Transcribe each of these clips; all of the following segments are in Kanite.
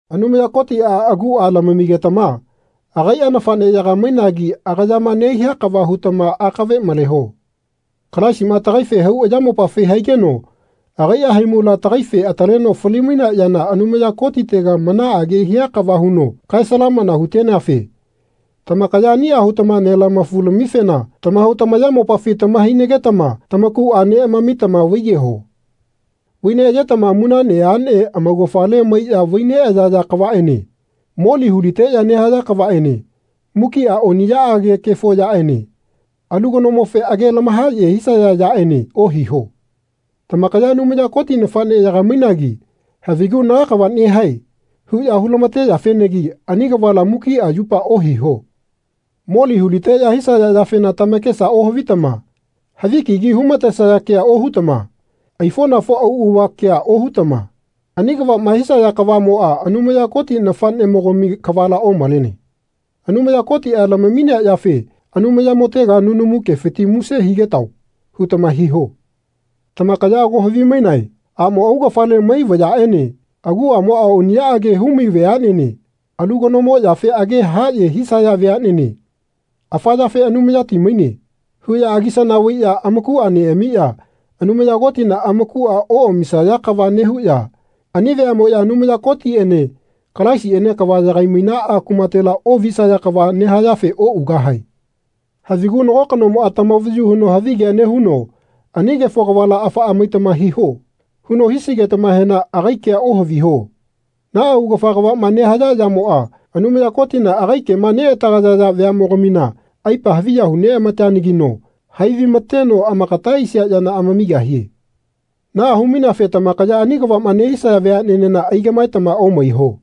Anumaya Kotia agua lamamigetama agaia nafaneyaga mainagi agayama nehia kava hutama akave maleho. Kalaisima tagaife hau ayamopafi haigeno agaia haimula tagaife ataleno fali-mainea yana Anumaya Kotitega manaage hia kava huno kae-salamana huteneafe tamakaya ania hutama nelamafu-lamifena tamahau tamayamopafi tamahainagetama tamakua neamamitama vaiyeho. Vai neayetama munane ane amaugafale maiya vai neayaya kavaene moli huliteya nehaya kavaene mukia ani oniyaage kefo yaene alu kanomofe age lamahaye hisaya yaene ohiho. Tamakaya Anumaya Koti nafaneyaga mainagi havigu Na kava nehae. huya hulamateyafenagi ani kavala mukia yupa ohiho. Moli huliteya hisaya yafena tamakesa ohavitama havi kigi humatesaya kea ohutama aifonafo augafa kea ohutama ani kavama hisaya kavamoa Anumaya Koti nafanemogami kavala omalene. Anumaya Kotia lamaminea yafe Anumayamotega nunamu kefiti muse higetao. hutama hiho. Tamakaya ago havimainae amo augafale mai vayaene aguamoa oniyaage humai veanene alu kanomo yafe age haye hisaya veanene afa yafe Anumayati maine. huya agisana vaiya amakua neamiya Anumaya Kotina amakua oamisaya kava nehuya ani veamoya Anumaya Kotiene Kalaisiene kavama yagai-mainaa kumatela ovisaya kava nehayafe ougahae. Havigu nago kanomoa tamavayu huno havigea nehuno Ani kefo kavala afaa maitama hiho. huno hisigetamahena agai kea ohaviho. Naa augafa kavama nehaya yamoa Anumaya Kotina agai kema neatagayaya vayamogamina aipa haviya hu neamateanagino hai vaimateno amakata aisia yana amamigahie. Naa humaineafe tamakaya ani kavama nehisaya veanenena aigamaetama omaiho.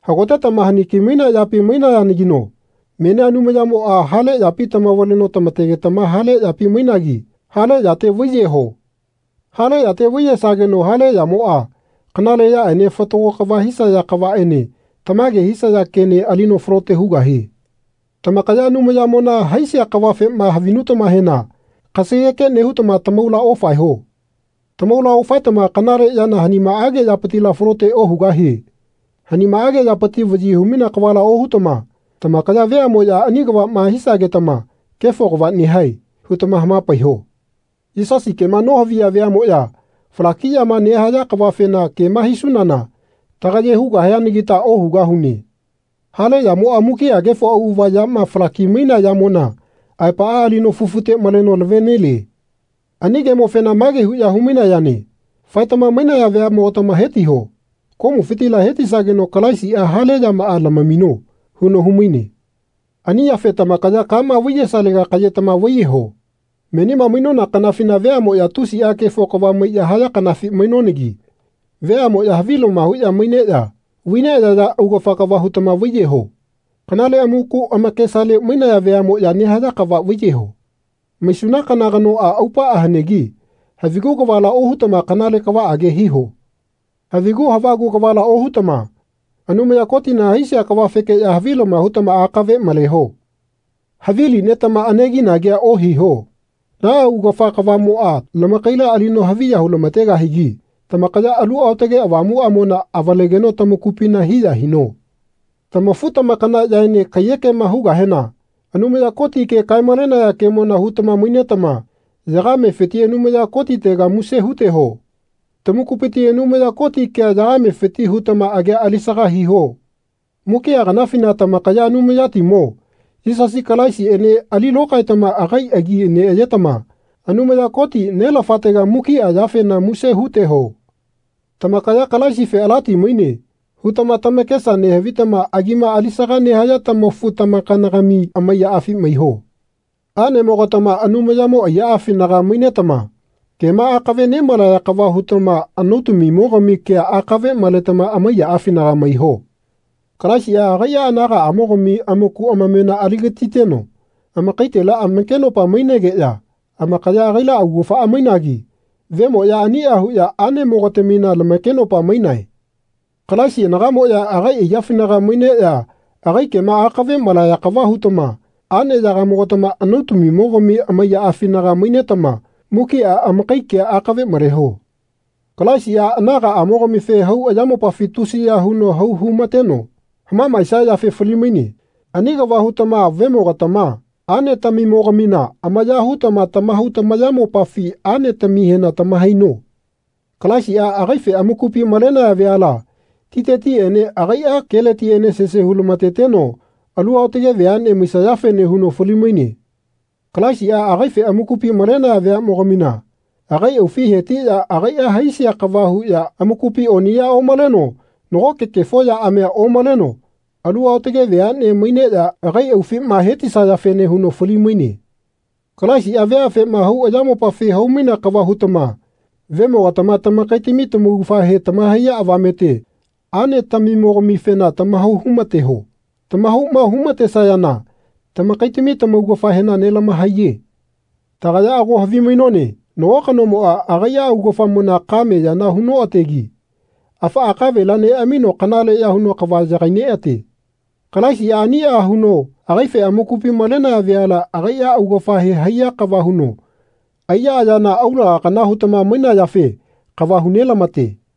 Hagotetama haniki mainea yapi mainayanagino menia Anumayamoa hale yapi tamavaleno tamategetama hale yapi mainagi hale yate vaiyeho. Hale yate vaiyesageno hale yamoa kanale yaene fatago kava hisaya kavaene tamage hisaya kene alino falote hugahie. Tamakaya Anumayamona haisia kavafema havinutamahena kasageke nehutama tamaula ofaeho. Tamaula ofaetama kanale yana hanimaage yapitila falote ohugahie. Hanimaage yapiti vayi humainea kavala ohutama tamakaya veamoya ani kavama hisagetama Kefo kava nehae. hutama hamapaiho. Yisasi kema nohaviya veamoya falakiyama nehaya kavafena kema hisunana tagaye hugahianagita ohugahune. Hale yamoa mukia kefo auava yama falaki-mainea yamona aepaa alino fufute maleno lavenelie. Ani kemofena mage huya humainayane Faetama mainaya veamogatama hetiho. Komufitila hetisageno Kalaisia hale yamaa lamamino. huno humaine. Ani yafe tamakaya kama vaiyesalega kayetama vaiyeho. Menima mainona kanafina veamoya tusia kefo kava maiya haya kafi mainonagi veamoya havilama huya maineya vaineayaya augafa kava hutama vaiyeho. Kanale amaku amakesale mainaya veamoya nehaya kava vaiyeho. Maisuna kana kanoa aupaa hanegi havigu kavala ohutama kanale kavaage hiho. Havigu havagu kavala ohutama Anumaya Kotina haisia kavafekeya havilama hutama akave maleho. Havili netama anegi-nagia ohiho. Naa augafa kavamoa lamakaila alino haviya hulamategahigi tamakaya Alu Aotage Avamuamona avalegeno tamakupina hiya hino. Tamafu-tamakanayaene kaiyekema hugahena Anumaya Koti ke kae-malenaya kemona hutama mainetama yagamefiti Anumaya Kotitega muse huteho. Tamakupiti Anumaya Koti kea yagamefiti hutama agia alisaga hiho. Mukia kanafina tamakaya Anumayatimo, Yisasi Kalaisiene ali lokaetama agai agi neayetama Anumaya Koti, Nelafatega mukia yafena muse huteho. Tamakaya Kalaisife alati maine hutama tamakesa nehavitama agima alisaga nehaya tamafu-tamakana-gamife amaiyaafi maiho. Anemogatama Anumayamo aiyaafinaga mainetama kema akave nemalaya kava hutama anautamimo-gami kea akave maletama amaiyaafinaga maiho. Kalaisia agaia anagamogami amaku amamena aligatiteno amakaitela amakenopa mainegeya amakaya agaila augafaa mainagi vemoya ania huya anemogatamina lamakenopa mainane. Kalaisina anagamoya agai aiyafinaga maineya agai kema akave malaya kava hutama aneyaga-mogatama anautami-mogami amaiyafinaga mainetama mukia amakai kea akave maleho. Kalaisia anagaamogamife hau ayamopafi tusiya huno hau humateno hamamaesia yafe fali-maine. Ani kava hutama vemogatama anetamimo-gamina amaya hutama tamahau tamayamopafi anetamihena tamahaino. Kalaisia agaife amakupi malenaya veala titetiene agaia keletiene sese hu-lamateteno alu aotage veane maisayafene huno fali-maine. Kalaisia agaife amakupi malenaya veamogamina agai aufi hetiya agaia haisia kava huya amakupi oniya omaleno nagoke kefo yaamia omaleno alu aotage veane maineya agai aufima hetisayafene huno fali-maine. Kalaisia veafema hau ayamopafi hau-mainea kava hutama vemogatama tamakaitami tamaugafahe tamahaiya avamete anetamimo-gamifena tamahau humateho. Tamahauma hu-matesayana tamakaitami lamaugafahena nelamahaiye. Tagaya ago havimainone nago kanomoa agaia augafamona kame yana hunoategi afaa kavela neamino kanaleya huno kava yagai neate. Kalaisia ania huno agaife amakupi malenaya veala agaia augafahe haiya kava huno aiya ayana aulaga kana hutama mainayafe kava hu nelamate.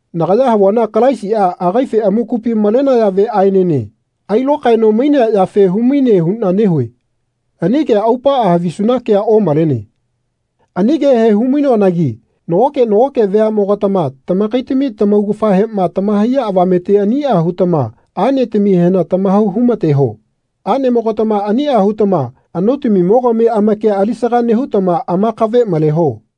Nagaya havuana Kalaisia agaife amakupi malenaya veaenene ailokaeno mainea yafe humaine huna nehue. Ani kea aupaa havisuna kea omalene. Ani kehe humainoanagi nagoke nagoke veamogatama tamakaitami tamaugafahema tamahaiya avamete ania hutama anetamihena tamahau humateho. Anemogatama ania hutama anautami-mogami amakia alisaga nehutama amakave maleho.